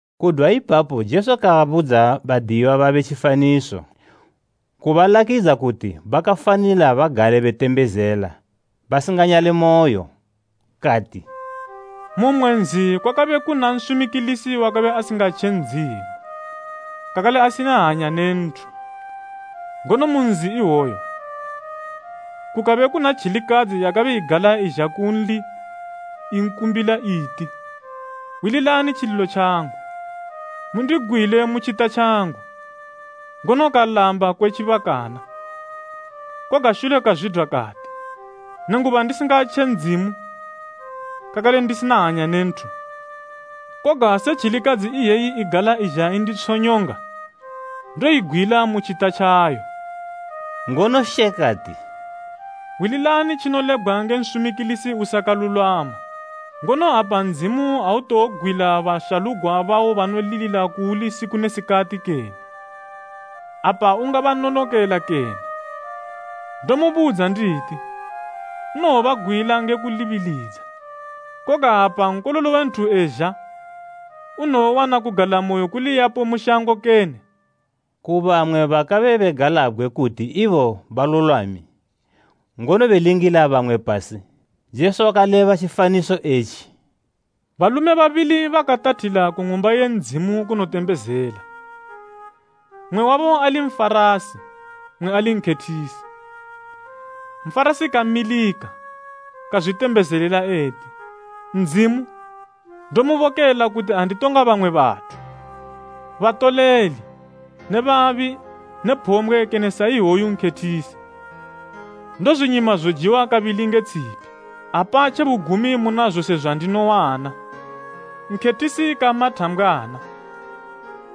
Kudwa ipapo Jesu kabudza badiyiwa babe tjifaniso, kubalakidza kuti bakafanila bagale betembezela basinganyalemoyo. Kati, “Mu mmwe nzi kwakabe kuna nsumikilisi wakabe asingatje Ndzimu, kakale asina hanya ne nthu. Ngono mu nzi iwoyo, kukabe kuna tjilikadzi yakabe igala izha kunli i kumbila, iti, ‘Hwililani tjililo tjangu, mundigwile mu tjita tjangu.’ Ngono kalamba kwe tjibakana. Koga shule kazwidwa kati, ‘Nenguba ndisingatje Ndzimu, kakale ndisina hanya ne nthu, koga se tjilikadzi iyeyi igala izha enditshonyonga, ndoyigwila mu tjita tjayo!’” Ngono She kati, “Hwililani tjinolebgwa nge nsumikilisi usakalulwama. Ngono apa Ndzimu autowogwila bashalugwa bawo banolilila kuuli siku ne sikati kene? Apa ungabanonokela kene? Ndomubudza nditi, unowobagwila nge kulibilidza. Koga apa Nkololo we nthu ezha, unowowana kugalamoyo kuliyapo mu shango kene?” Ku bamwe bakabe begalabgwe kuti ibo balulwami, ngono belingila bamwe pasi, Jesu wakaleba tjifaniso etji, “Balume babili bakatathila ku Ng'umba ye Ndzimu kunotembezela, mmwe wabo ali Nfarasi, mmwe ali nkhethisi. “Nfarasi kamilika, kazwitembezelela eti, ‘Ndzimu, ndomubokela kuti anditonga bamwe bathu, batoleli ne babi ne phombgwe kene sa iwoyu nkhethisi. Ndozwinyima zojiwa kabili nge tshipi, apa tjebugumi muna zose zwandinowana.’ “Nkhethisi kama thambgwana,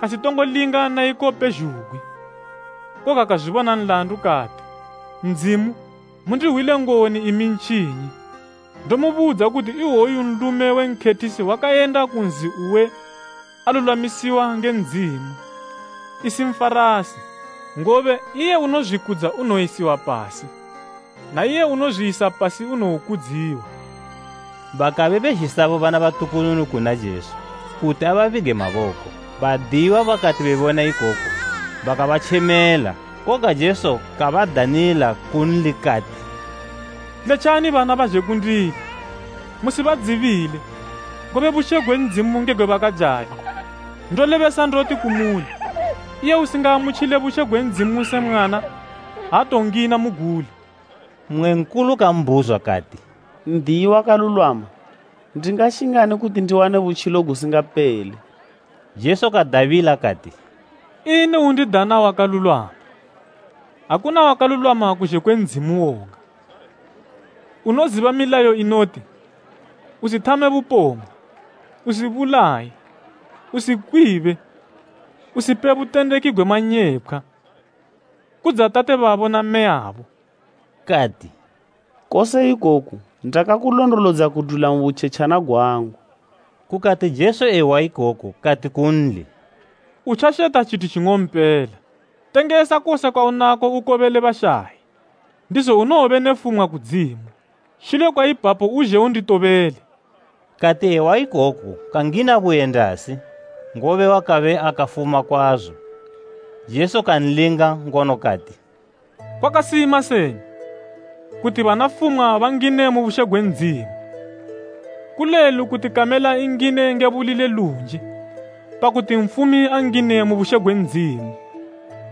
kasitongo linga na iko pezhugwi, koga kazwibona nladu kati, ‘Ndzimu, mundihwile ngoni imi ntjinyi.’ Ndomubudza kuti iwoyu nlume we nkhethisi wakayenda ku nzi uwe alulwamisiwa nge Ndzimu, isi Nfarasi; ngobe, iye unozwikudza unowoyisiwa pasi, na iye unozwiyisa pasi unowokudziwa.” Bakabe bezhisa bo bana batukununu kuna Jesu, kuti ababige maboko. Badiyiwa bakati bebona ikoku bakabatjemela. Koga Jesu kabadanila kunli kati, “Letjani bana bazhe kundili, musibadzibile, ngobe bushe gwe Ndzimu nge gwe bakajali. Ndolebesa ndoti kumuli, iye usingaamutjile bushe gwe Ndzimu se mwana, aatowongina muguli.” Mmwe nkulu kambhuzwa kati, “N'diyi wakalulwama, ndingashingani kuti ndiwane butjilo gusingapele?” Jesu kadabila kati, “Ini undidana wakalulwama? Akuna wakalulwama kuzhe kwe Ndzimu woga. Unoziba milayo inoti, ‘Usithame bupombgwe, usibulaye, usikwibe, usipe butendeki gwe manyepkhwa, kudza tate babo na mmeyabo.’” Kati, “Kose ikoku ndakakulondolodza kudwila mu butjetjana gwangu.” Kukati Jesu ehwa ikoku kati kunli, “Utjasheta tjithu tjing'ompela. Tengesa kose kwaunako ukobele bashayi, ndizo unowobe ne fumwa kudzimu. Shule kwa ipapo uzhe unditobele.” Kati ehwa ikoku kangina buyendasi, ngobe wakabe akafuma kwazo. Jesu kanlinga ngono kati, “Kwakasima seni, kuti bana fumwa bangine mu bushe gwe Ndzimu! Kulelu kuti kamela ingine nge buli le lunji, pakuti nfumi angine mu bushe gwe Ndzimu.”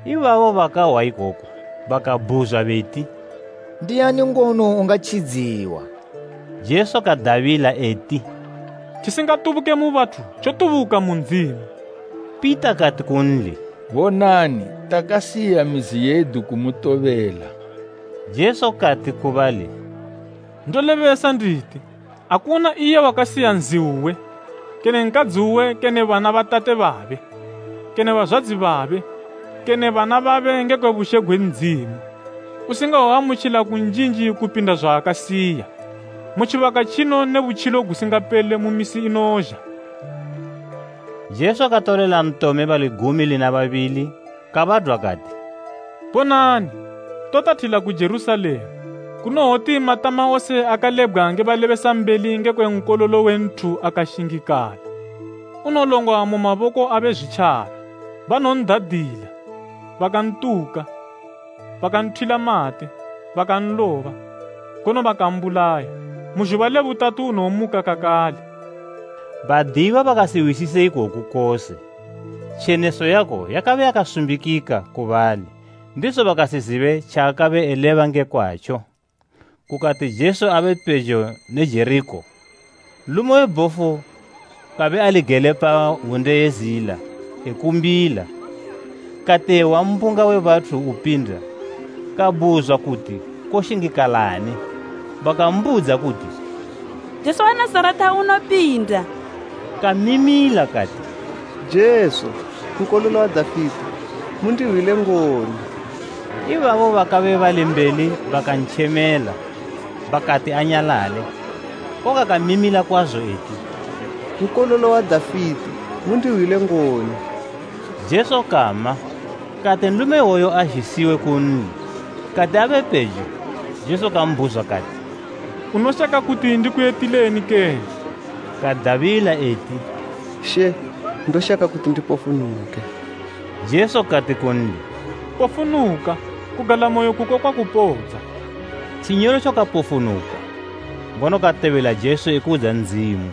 Ibabo bakahwa ikoku, bakabhuzwa beti, “Ndiani ngono ungatjidziwa?” Jesu kadabila eti, “Tjisingatubuke mu bathu tjotubuka mu Ndzimu.” Pita kati kunli, “Bonani, takasiya mizi yedu kumutobela.” Jesu kati ku bali, “Ndolebesa nditi, akuna iye wakasiya nzi uwe, kene nkadzi uwe kene bana ba tate babe, kene bazwadzi babe, kene bana babe ngekwe bushe gwe Ndzimu, usingawoamutjila kunjinji kupinda zwaakasiya, mu tjibaka tjino ne butjilo gusingapele mu misi inozha.” Jesu katolela ntome bali gumi lina babili kabadwa kati, “Bonani, totathila ku Jerusalema, kunowoti matama wose akalebgwa nge balebesambeli ngekwe Nkololo we Nthu, akashingikala. Unolongwa mu maboko abe Zwitjaba. Banowon'dadila, bakantuka, bakanthwila mate, bakanloba, ngono bakambulaya. Mu zhuba le butatu unowomuka kakale.” Badiyiwa bakasihwisise ikoku kose. Tjeneso yako yakabe yakasumbikika ku bali, ndizo bakasizibe tjaakabe eleba nge kwatjo. Kukati Jesu apejo ne Jerikho, nlume we bhofu kabe ali gele pa hwunde ye zila e kumbila. Kati ehwa mbunga we bathu upinda, kabhuzwa kuti koshingikalani. Bakambudza kuti, “Jesu we Nazareta unopinda.” Kamimila kati, “Jesu, Nkololo wa Dafite, mundihwile ngoni!” Ibabo bakabe bali mbeli bakantjemela bakati anyalale, koga kamimila kwazo eti, “Nkololo wa Dafite, mundihwile ngoni!” Jesu kama, kati nlume iwoyo azhisiwe kunli. Kati abe pejo, Jesu kambhuzwa kati, “Unoshaka kuti ndikuyitileni kene?” Kadabila eti, “She, ndoshaka kuti ndipofunuke.” Jesu kati kunli, “Pofunuka! Kugalamoyo kuko kwakupodza.” Tjinyolotjo kapofunuka, ngono katobela Jesu ekudza Ndzimu.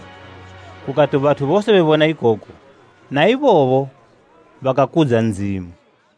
Kukati bathu bose bebona ikoku, na ibobo bakakudza Ndzimu.